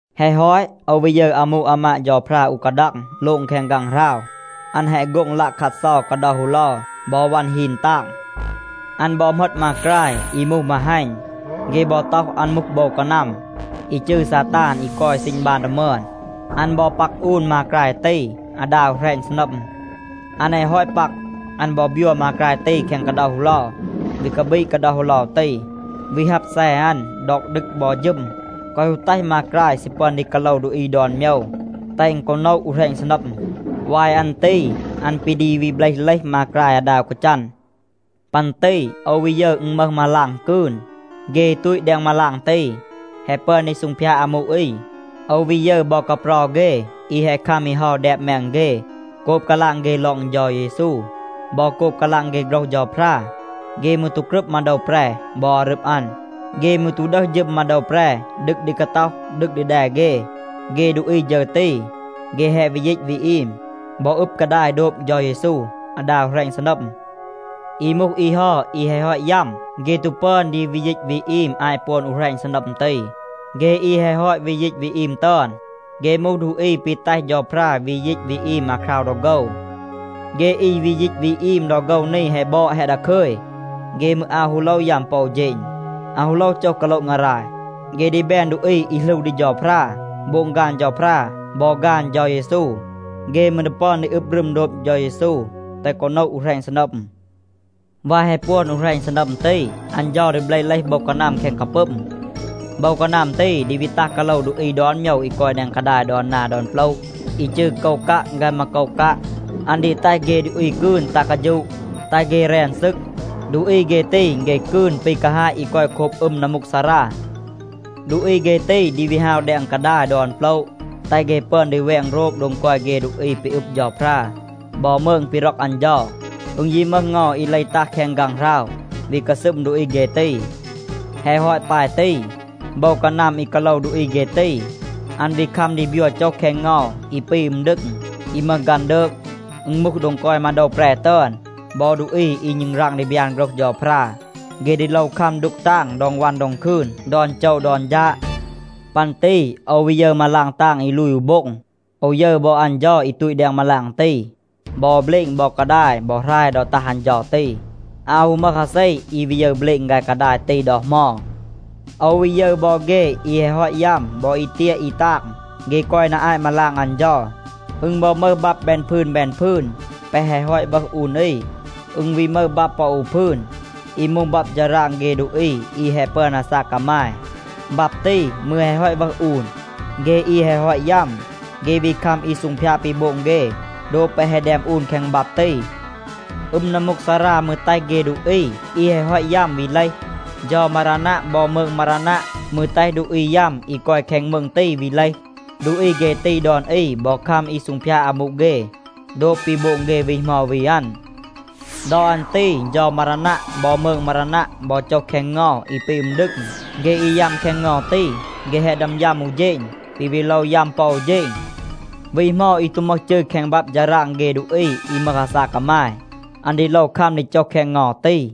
แฮะ ฮอต, โอว วี ยึร อามู อามาด เฌาพรา อู กาดัง โลง แคง ฆางหราว. อัน แฮะ โฆ็ง ลัะคัดเซา กาเดา ฮูเลา บอ วัน ฮีน ตาง. อัน บอ เหมต มากราย อี มูห มาฮัณ. เฆ บอ ต็อห อัน มูห โบว กานัม, อี จืร ซาตาน อี กอย ซีณ บาน ดอ มึอน. อัน บอ ปัก อูน มากราย ตี อาดา อู แหรณ ซีนัม. อัน แฮะ ฮอต ปัก, อัน บอ บยัว มากราย ตี แคง กาเดา ฮูเลา, วี กาปีด กาเดา ฮูเลา ตี, วี ฮับ แซ อัน ดอก ดึก บอ ฌึม, แกวะ ฮู แตห มากราย ซี ปึอน ดี กาโลว ดูอี ดอน โมยว, แตห อึณ กอ โนะ อู แหรณ ซีนัม. วาย อัน ตี อัน ปี ดี วี เบลห เลห มากราย อาดา อู กาจัน. ปัน ตี โอว วี ยึร อึณ มึห มาลาง กืน. เฆ อี ตูต แดง มาลาง ตี, แฮะ ปึอน ดี ซูงพยาด อามู อี. โอว วี ยึร บอ กาเปรา เฆ อี แฮะ คัม อี เฮา แดบ แมง เฆ โกบ กาลาง เฆ ลอง เฌา เยซู บอ โกบ กาลาง เฆ โฆรห เฌาพรา. เฆ มืร ตู กรึบ มาโดว แปร บอ อารึบ อัน. เฆ มืร ตู ดึห ฌึม มาโดว แปร ดึก ดี กาต็อห, ดึก ดี แด เฆ. เฆ ดูอี ฌึร ตี, เฆ แฮะ วี ยีต วี อีม, บอ อึบ กาดาย โดบ เฌา เยซู อาดา อู แหรณ ซีนัม. อี มูห อี เฮา อี แฮะ ฮอต ยัม, เฆ ตู ปึอน ดี วี ยีต วี อีม อาต ปวน อู แหรณ ซีนัม ตี. เฆ อี แฮะ ฮอต วี ยีต วี อีม ตึอน, เฆ มูห ดูอี ปี แตห เฌาพรา วี ยีต วี อีม อาคราว ดอ โฆว. เฆ อี วี ยีต วี อีม ดอ โฆว นี แฮะ บอด, แฮะ ดาคึย. เฆ มืร อาว ฮู โลว ยัม ปอ อู เฌณ, อาว ฮู โลว โจห กาโละ งาราย. เฆ ดี แบน ดูอี อี หลู ดี เฌาพรา, โบง ฆาน เฌาพรา บอ ฆาน เฌา เยซู. เฆ มืร ดี ปึอน ดี อึบ รึม โดบ เฌา เยซู, แตห กอ โนะ อู แหรณ ซีนัม. วาย แฮะ ปวน อู แหรณ ซีนัม ตี, อัน เฌา ดี เบลห เลห โบว กานัม แคง กาปึม. โบว กานัม ตี ดี วี ตัห กาโลว ดูอี ดอน โมยว อี กอย แดง กาดาย ดอน นา ดอน โปละ อี จืร โกวกัะ ฆาย มาโกวกัะ. อัน ดี แตห เฆ ดูอี กืน ตัห กาฌูะ, แตห เฆ แรน ซึก. ดูอี เฆ ตี, เฆ กืน ปี กาฮาต อี กอย โคบ อึม นัมมูกซารา. ดูอี เฆ ตี ดี วี ฮาว แดง กาดาย ดอน โปละ, แตห เฆ ปึอน ดี แวง โรบ โดง กอย เฆ ดูอี ปี อึบ เฌาพรา บอ มืง ปี ร็อก อัน เฌา. อึณ ยี มึห เงา อี เลห ตัห แคง ฆางหราว, วี กาซึม ดูอี เฆ ตี. แฮะ ฮอต ปาย ตี, โบว กานัม อี กาโลว ดูอี เฆ ตี, อัน วี คัม ดี บยัว โจห แคง เงา อี ปี อึม ดึง, อี มึห ฆันดืก. อึณ มูห โดง กอย มาโดว แปร ตึอน บอ ดูอี อี ณึงราง ดี บยาน โฆรห เฌาพรา. เฆ ดี โลว คัม ดูก ตาง ดอง วัน ดอง คืน ดอน โจว ดอน ฌาด. ปัน ตี โอว วี ยึร มาลาง ตาง อี ลูย อู โบ็ง. โอว ยึร บอ อัน เฌา อี ตูต แดง มาลาง ตี. บอ เบลณ บอ กาดาย บอ หราย ดอ ตัห อัน เฌา ตี, อาว ฮู มึห อาเซ อี วี ยึร เบลณ ฆาย กาดาย ตี ดอ เหมา. โอว วี ยึร บอ เฆ อี แฮะ ฮอต ยัม บอ อี เตียะ อี ตาง, เฆ กอย นา อาต มาลาง อัน เฌา. อึณ บอ มึห บับ แบน พืน แบน พืน แปะ แฮะ ฮอต วึห อูน อี. อึณ วี มึห บับ ปอ อู พืน อี มูห บับ ฌาราง เฆ ดูอี อี แฮะ ปึอน อาซาก กามาย. บับ ตี มืร แฮะ ฮอต วึห อูน. เฆ อี แฮะ ฮอต ยัม เฆ วี คัม อี ซูงพยาด ปี โบง เฆ โดบ แปะ แฮะ แดม อูน แคง บับ ตี. อึม นัมมูกซารา มืร แตห เฆ ดูอี อี แฮะ ฮอต ยัม วี เลห. เฌา มารานัะ บอ มืง มารานัะ มืร แตห ดูอี ยัม อี กอย แคง มืง ตี วี เลห. ดูอี เฆ ตี ดอน อี บอ คัม อี ซูงพยาด อามู เฆ โดบ ปี โบง เฆ วี เหมา วี อัน. ดอ อัน ตี เฌา มารานัะ บอ มืง มารานัะ บอ โจห แคง เงา อี ปี อึม ดึง. เฆ อี ยัม แคง เงา ตี, เฆ แฮะ ดึอม ยัม อู เฌณ, ปี วี โลว ยัม ปอ อู เฌณ. วี เหมา อี ตู มึห จืร แคง บับ ฌาราง เฆ ดูอี อี มึห อาซาก กามาย, อัน ดี โลว คัม ดี โจห แคง เงา ตี.